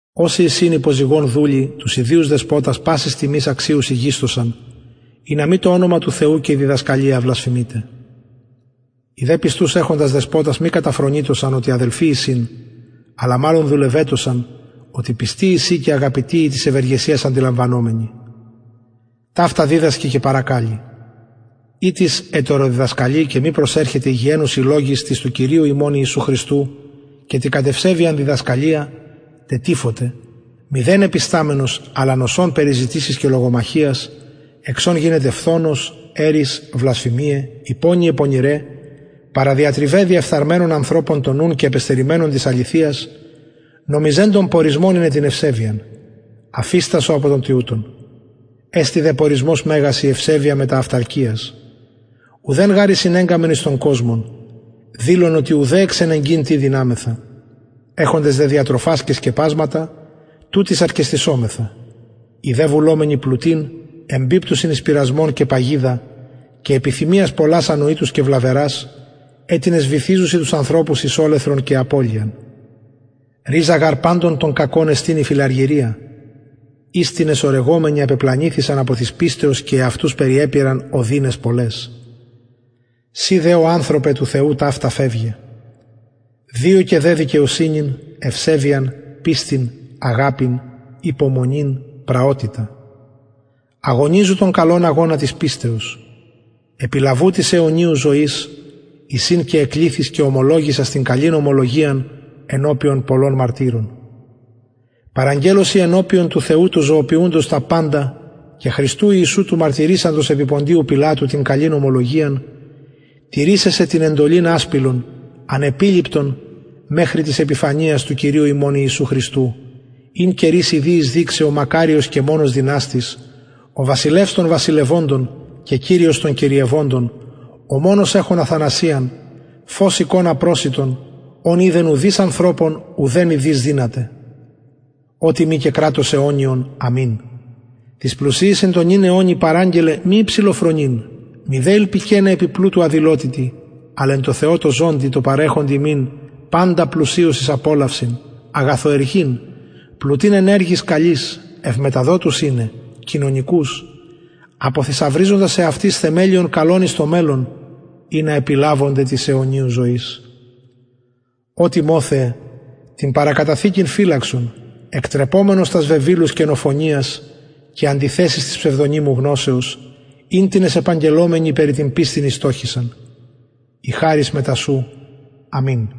οσοι εισιν υπο ζυγον δουλοι τους ιδιους δεσποτας πασης τιμης αξιους ηγεισθωσαν ινα μη το ονομα του θεου και η διδασκαλια βλασφημηται οι δε πιστους εχοντες δεσποτας μη καταφρονειτωσαν οτι αδελφοι εισιν αλλα μαλλον δουλευετωσαν οτι πιστοι εισιν και αγαπητοι οι της ευεργεσιας αντιλαμβανομενοι ταυτα διδασκε και παρακαλει ει τις ετεροδιδασκαλει και μη προσερχεται υγιαινουσιν λογοις τοις του κυριου ημων ιησου χριστου και τη κατ ευσεβειαν διδασκαλια τετυφωται μηδεν επισταμενος αλλα νοσων περι ζητησεις και λογομαχιας εξ ων γινεται φθονος ερις βλασφημιαι υπονοιαι πονηραι διαπαρατριβαι διεφθαρμενων ανθρωπων τον νουν και απεστερημενων της αληθειας νομιζοντων πορισμον ειναι την ευσεβειαν αφιστασο απο των τοιουτων εστιν δε πορισμος μεγας η ευσεβεια μετα αυταρκειας ουδεν γαρ εισηνεγκαμεν εις τον κοσμον δηλον οτι ουδε εξενεγκειν τι δυναμεθα εχοντες δε διατροφας και σκεπασματα τουτοις αρκεσθησομεθα οι δε βουλομενοι πλουτειν εμπιπτουσιν εις πειρασμον και παγιδα και επιθυμιας πολλας ανοητους και βλαβερας αιτινες βυθιζουσιν τους ανθρωπους εις ολεθρον και απωλειαν ριζα γαρ παντων των κακων εστιν η φιλαργυρια ης τινες ορεγομενοι απεπλανηθησαν απο της πιστεως και εαυτους περιεπειραν οδυναις πολλαις συ δε ω ανθρωπε του θεου ταυτα φευγε διωκε δε δικαιοσυνην ευσεβειαν πιστιν αγαπην υπομονην πραοτητα αγωνιζου τον καλον αγωνα της πιστεως επιλαβου της αιωνιου ζωης εις ην εκληθης και ωμολογησας την καλην ομολογιαν ενωπιον πολλων μαρτυρων παραγγελλω σοι ενωπιον του θεου του ζωοποιουντος τα παντα και χριστου ιησου του μαρτυρησαντος επι ποντιου πιλατου την καλην ομολογιαν τηρησαι σε την εντολην ασπιλον ανεπιληπτον μεχρι της επιφανειας του κυριου ημων ιησου χριστου ην καιροις ιδιοις δειξει ο μακαριος και μονος δυναστης ο βασιλευς των βασιλευοντων και κυριος των κυριευοντων ο μονος εχων αθανασιαν φως οικων απροσιτον ον ειδεν ουδεις ανθρωπων ουδε ιδειν δυναται ω τιμη και κρατος αιωνιον αμην τοις πλουσιοις εν τω νυν αιωνι παραγγελλε μη υψηλοφρονειν μηδε ηλπικεναι επι πλουτου αδηλοτητι αλλ εν τω θεω τω ζωντι τω παρεχοντι ημιν παντα πλουσιως εις απολαυσιν αγαθοεργειν πλουτειν εν εργοις καλοις ευμεταδοτους ειναι κοινωνικους αποθησαυριζοντας εαυτοις θεμελιον καλον εις το μελλον ινα επιλαβωνται της αιωνιου ζωης ω τιμοθεε την παραθηκην φυλαξον εκτρεπομενος τας βεβηλους κενοφωνιας και αντιθεσεις της ψευδωνυμου γνωσεως ην τινες επαγγελλομενοι περι την πιστιν ηστοχησαν η χαρις μετα σου αμην